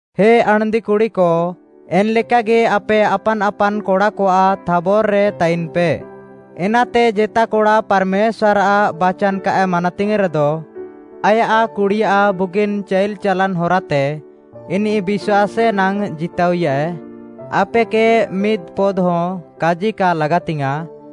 ହେ ଆଣ୍‌ଦି କୁଡ଼ିକ, ଏନ୍‌ଲେକାଗି ଆପେ ଆପାନ୍‌ ଆପାନ୍‌ କଡ଼ାକଆଃ ଥାବର୍‌ରେ ତାଇନ୍‌ପେ। ଏନାତେ ଜେତା କଡ଼ା ପାର୍‌ମେଶ୍ୱାର୍‌ଆଃ ବାଚାନ୍‌ କାଏ ମାନାତିଙ୍ଗ୍‌ରେଦ, ଆୟାଃ କୁଡ଼ିଆଃ ବୁଗିନ୍‌ ଚାଇଲ୍‌ ଚାଲାନ୍‌ ହରାତେ ଇନିଃ ବିଶ୍ୱାସେ ନାଙ୍ଗ୍‌ ଜିତାଅଇୟାଏ। ଆପେକେ ମିଦ୍‌ପଦ୍‌ହଁ କାଜି କା ଲାଗାତିଙ୍ଗ୍‌ୟାଁଃ,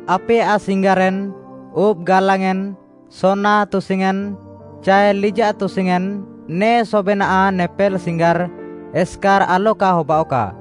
ଆପେୟାଃ ସିଙ୍ଗାରେନ୍‌, ଉବ୍‌ ଗାଲାଙ୍ଗ୍‌ୟେଁନ୍‌, ସୋନା ତୁସିୟେଁନ୍‌, ଚାଏ ଲିଜାଃ ତୁସିୟେଁନ୍‌, ନେ ସବେନାଃ, ନେପେଲ୍‌ ସିଙ୍ଗାର୍‌ ଏସ୍‌କାର୍‌ ଆଲକା ହବାଅଃକା,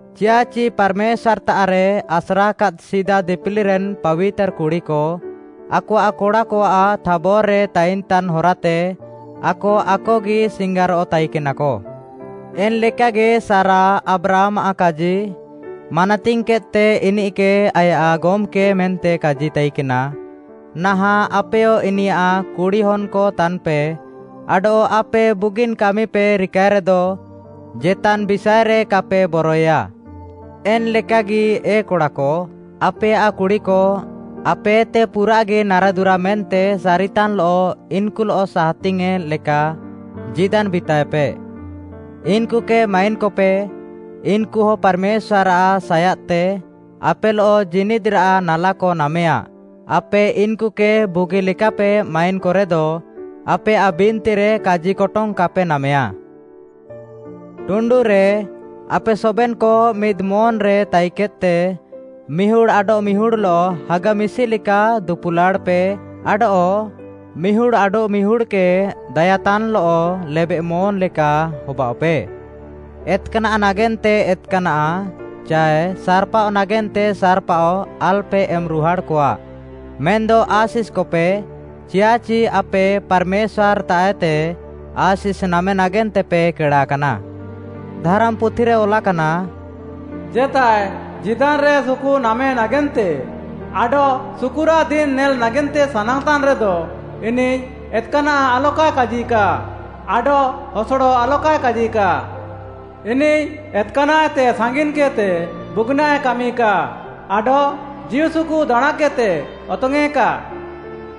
ଚିୟାଃଚି ପାର୍‌ମେଶ୍ୱାର୍‌ତାଃରେ ଆସ୍ରାକାଦ୍‌ ସିଦା ଦିପିଲିରେନ୍‌ ପାବିତାର୍‌ କୁଡ଼ିକ ଆକଆଃ କଡ଼ାକଆଃ ଥାବର୍‌ରେ ତାଇନ୍‌ତାନ୍‌ ହରାତେ ଆକ ଆକଗି ସିଙ୍ଗାରଃ ତାଇକେନାକ। ଏନ୍‌ଲେକାଗି ସାରା ଆବ୍ରାହାମ୍‌ଆଃ କାଜି ମାନାତିଙ୍ଗ୍‌କେଦ୍‌ତେ ଇନିଃକେ ଆୟାଃ ଗମ୍‌କେ ମେନ୍ତେ କାଜି ତାଇକେନା। ନାହାଁଃ ଆପେୟ ଇନିୟାଃ କୁଡ଼ିହନ୍‌କ ତାନ୍‌ପେ, ଆଡଃ ଆପେ ବୁଗିନ୍‌ କାମିପେ ରିକାଏରେଦ, ଜେତାନ୍‌ ବିଷାଏରେ କାପେ ବରଏୟା। ଏନ୍‌ଲେକାଗି ଏ କଡ଼ାକ, ଆପେୟାଃ କୁଡ଼ିକ, ଆପେଏତେ ପୁରାଃଗି ନାରାଦୁରା ମେନ୍ତେ ସାରିତାନ୍‌ଲଃ ଇନ୍‌କୁଲଃ ସାହାତିଙ୍ଗ୍‌ୟେଁ ଲେକା ଜୀଦାନ୍‌ ବିତାଏପେ। ଇନ୍‌କୁକେ ମାଇନ୍‌କପେ, ଇନ୍‌କୁହ ପାର୍‌ମେଶ୍ୱାର୍‌ଆଃ ସାୟାଦ୍‌ତେ ଆପେଲଃ ଜୀନିଦ୍‌ରାଃ ନାଲାକ ନାମେୟା ଆପେ ଇନ୍‌କୁକେ ବୁଗିଲେକାପେ ମାଇନ୍‌କରେଦ, ଆପେୟାଃ ବିନ୍ତିରେ କାଜିକଟଙ୍ଗ୍‌ କାପେ ନାମେୟା। ଟୁଣ୍ଡୁରେ, ଆପେ ସବେନ୍‌କ ମିଦ୍‌ ମନ୍‌ରେ ତାଇନ୍‌କେଦ୍‌ତେ ମିହୁଡ଼୍‌ ଆଡଃମିହୁଡ଼୍‌ଲଃ ହାଗା ମିଶିଲେକା ଦୁପୁଲାଡ଼ଃପେ ଆଡଃ ମିହୁଡ଼୍‌ ଆଡଃମିହୁଡ଼୍‌କେ ଦାୟାତାନ୍‌ଲଃ ଲେବେଃମନ୍‌ ଲେକା ହବାଅଃପେ। ଏତ୍‌କାନାଃ ନାଗେନ୍ତେ ଏତ୍‌କାନାଃ, ଚାଏ ସାର୍‌ପାଅ ନାଗେନ୍ତେ ସାର୍‌ପାଅ ଆଲ୍‌ପେ ଏମ୍‌ରୁହାଡ଼୍‌କଆ, ମେନ୍‌ଦ ଆଶିଷ୍‌କପେ, ଚିୟାଃଚି ଆପେ ପାର୍‌ମେଶ୍ୱାର୍‌ତାଃଏତେ ଆଶିଷ୍‌ ନାମେ ନାଗେନ୍ତେପେ କେଡ଼ାକାନା। ଧାରାମ୍‌ପୁଥିରେ ଅଲାକାନା, “ଜେତାଏ ଜୀଦାନ୍‌ରେ ସୁକୁ ନାମେ ନାଗେନ୍ତେ ଆଡଃ ସୁକୁରାଃ ଦିନ୍‌ ନେଲ୍‌ ନାଗେନ୍ତେ ସାନାଙ୍ଗ୍‌ତାନ୍‌ରେଦ, ଇନିଃ ଏତ୍‌କାନାଃ ଆଲକାଏ କାଜିକା ଆଡଃ ହସଡ଼ ଆଲକାଏ କାଜିକା। ଇନିଃ ଏତ୍‌କାନାଃଏତେ ସାଙ୍ଗିନ୍‌କେଦ୍‌ତେ ବୁଗିନାଃଏ କାମିକା, ଆଡଃ ଜୀଉସୁକୁ ଦାଣାଁଁକେଦ୍‌ତେ ଅତଙ୍ଗ୍‌ୟେଁକା।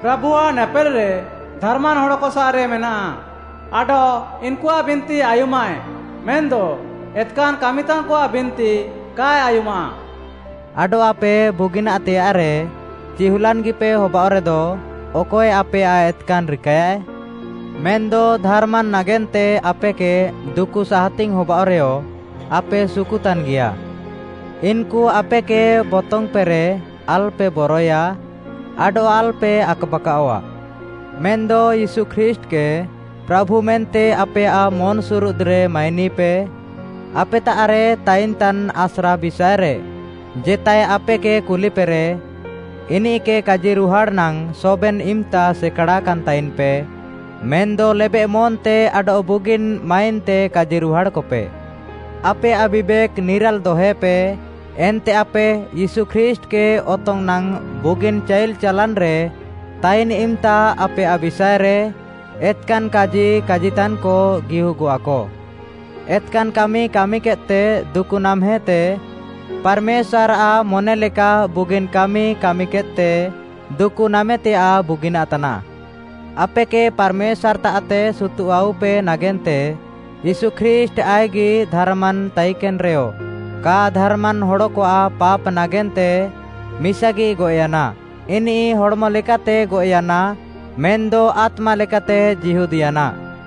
ପ୍ରାଭୁଆଃ ନେପେଲ୍‌ରେ ଧାର୍‌ମାନ୍‌ ହଡ଼କସାଃରେ ମେନାଃ, ଆଡଃ ଇନ୍‌କୁଆଃ ବିନ୍ତି ଆୟୁମାଃଏ, ମେନ୍‌ଦ ଏତ୍‌କାନ୍‌ କାମିତାନ୍‌କଆଃ ବିନ୍ତି କାଏ ଆୟୁମାଃ।” ଆଡଃ ଆପେ ବୁଗିନାଃତେୟାଃରେ ଚିହୁଲାନ୍‌ଗିପେ ହବାଅଃରେଦ, ଅକଏ ଆପେୟାଃ ଏତ୍‌କାନ୍‌ ରିକାୟାଏ? ମେନ୍‌ଦ ଧାର୍‌ମାନ୍‌ ନାଗେନ୍ତେ ଆପେକେ ଦୁକୁ ସାହାତିଙ୍ଗ୍‌ ହବାଅଃରେୟ, ଆପେ ସୁକୁତାନ୍‌ଗିଆ। ଇନ୍‌କୁ ଆପେକେ ବତଙ୍ଗ୍‌ପେରେ ଆଲ୍‌ପେ ବରଏୟା, ଆଡଃ ଆଲ୍‌ପେ ଆକ୍‌ବାକାଅଃଆ। ମେନ୍‌ଦ ୟୀଶୁ ଖ୍ରୀଷ୍ଟ୍‌କେ ପ୍ରାଭୁ ମେନ୍ତେ ଆପେୟାଃ ମନ୍‌ସୁରୁଦ୍‌ରେ ମାଇନିପେ। ଆପେତାଃରେ ତାଇନଃତାନ୍‌ ଆସ୍ରା ବିଷାଏରେ ଜେତାଏ ଆପେକେ କୁଲିପେରେ, ଇନିଃକେ କାଜିରୁହାଡ଼୍‌ ନାଙ୍ଗ୍‌ ସବେନ୍‌ ଇମ୍‌ତା ସେକାଡ଼ାକାନ୍‌ ତାଇନ୍‌ପେ, ମେନ୍‌ଦ ଲେବେଃମନ୍‌ତେ ଆଡଃ ବୁଗିନ୍‌ ମାଇନ୍‌ତେ କାଜିରୁହାଡ଼୍‌କପେ। ଆପେୟାଃ ବିବେକ୍‌ ନିରାଲ୍‌ ଦହେପେ, ଏନ୍ତେ ଆପେ ୟୀଶୁ ଖ୍ରୀଷ୍ଟ୍‌କେ ଅତଙ୍ଗ୍‌ ନାଙ୍ଗ୍‌ ବୁଗିନ୍‌ ଚାଇଲ୍‌ ଚାଲାନ୍‌ରେ ତାଇନ୍‌ ଇମ୍‌ତା ଆପେୟାଃ ବିଷାଏରେ ଏତ୍‌କାନ୍‌ କାଜି କାଜିତାନ୍‌କ ଗିହୁଗଃଆକ ଏତ୍‌କାନ୍‌ କାମି କାମିକେଦ୍‌ତେ ଦୁକୁ ନାମ୍‌ହେତେ, ପାର୍‌ମେଶ୍ୱାର୍‌ଆଃ ମନେଲେକା ବୁଗିନ୍‌ କାମି କାମିକେଦ୍‌ତେ ଦୁକୁ ନାମେତେୟାଃ ବୁଗିନାଃ ତାନାଃ। ଆପେକେ ପାର୍‌ମେଶ୍ୱାର୍‌ତାଃତେ ସୁତୁଃଆଉପେ ନାଗେନ୍ତେ ୟୀଶୁ ଖ୍ରୀଷ୍ଟ୍‌ ଆଇଃକ୍‌ଗି ଧାର୍‌ମାନ୍‌ ତାଇକେନ୍‌ରେୟ କା ଧାର୍‌ମାନ୍‌ ହଡ଼କଆଃ ପାପ୍‌ ନାଗେନ୍ତେ ମିସାଗି ଗଏଃୟାନା। ଇନିଃ ହଡ଼୍‌ମ ଲେକାତେ ଗଏଃୟାନା ମେନ୍‌ଦ ଆତ୍ମା ଲେକାତେ ଜୀହୁଦ୍‌ୟାନା,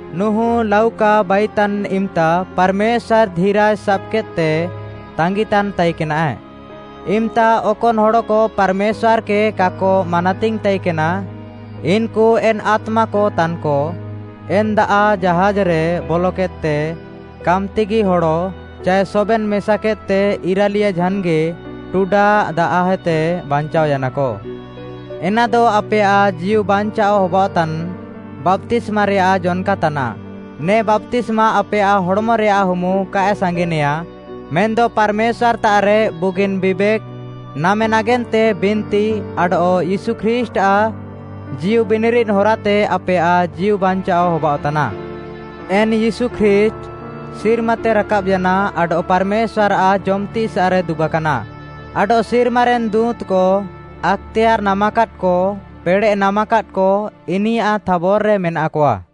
ନୁହୁଁ ଲାଉକା ବାଇତାନ୍‌ ଇମ୍‌ତା ପାର୍‌ମେଶ୍ୱାର୍‌ ଧିରାଜ୍‌ ସାବ୍‌କେଦ୍‌ତେ ତାଙ୍ଗିତାନ୍‌ ତାଇକେନାଏ, ଇମ୍‌ତା ଅକନ୍‌ ହଡ଼କ ପାର୍‌ମେଶ୍ୱାର୍‌କେ କାକ ମାନାତିଙ୍ଗ୍‌ ତାଇକେନା, ଇନ୍‌କୁ ଏନ୍‌ ଆତ୍ମାକ ତାନ୍‌କ। ଏନ୍‌ ଦାଆଃ ଜାହାଜ୍‌ରେ ବଲକେଦ୍‌ତେ କାମ୍‌ତିଗି ହଡ଼, ଚାଏ ସବେନ୍‌ ମେସାକେଦ୍‌ତେ ଇରାଲିୟା ଝାନ୍‌ଗି ଟୁଡା ଦାଆଃହେତେ ବାଞ୍ଚାଅୟାନାକ। ଏନାଦ ଆପେୟାଃ ଜୀଉବାଞ୍ଚାଅ ହବାଅଃତାନ୍‌ ବାପ୍ତିସ୍ମାରେୟାଃ ଜନ୍‌କା ତାନାଃ। ନେ ବାପ୍ତିସ୍ମା ଆପେୟାଃ ହଡ଼୍‌ମରେୟାଃ ହୁମୁ କାଏ ସାଙ୍ଗିନେଆଁ, ମେନ୍‌ଦ ପାର୍‌ମେଶ୍ୱାର୍‌ତାଃରେ ବୁଗିନ୍‌ ବିବେକ୍‌ ନାମେ ନାଗେନ୍ତେ ବିନ୍ତି, ଆଡଃ ୟୀଶୁ ଖ୍ରୀଷ୍ଟ୍‌ଆଃ ଜୀଉବିନିରିଦ୍‌ ହରାତେ ଆପେୟାଃ ଜୀଉବାଞ୍ଚାଅ ହବାଅଃତାନା ଏନ୍‌ ୟୀଶୁ ଖ୍ରୀଷ୍ଟ୍‌ ସିର୍ମାତେ ରାକାବ୍‌ୟାନା ଆଡଃ ପାର୍‌ମେଶ୍ୱାର୍‌ଆଃ ଜମ୍‌ତିସାଃରେ ଦୁବାକାନା, ଆଡଃ ସିର୍ମାରେନ୍‌ ଦୁଁତ୍‌କ, ଆକ୍‌ତେୟାର୍‌ ନାମାକାଦ୍‌କ, ପେଡ଼େଃ ନାମାକାଦ୍‌କ ଇନିୟାଃ ଥାବର୍‌ରେ ମେନାକଆ।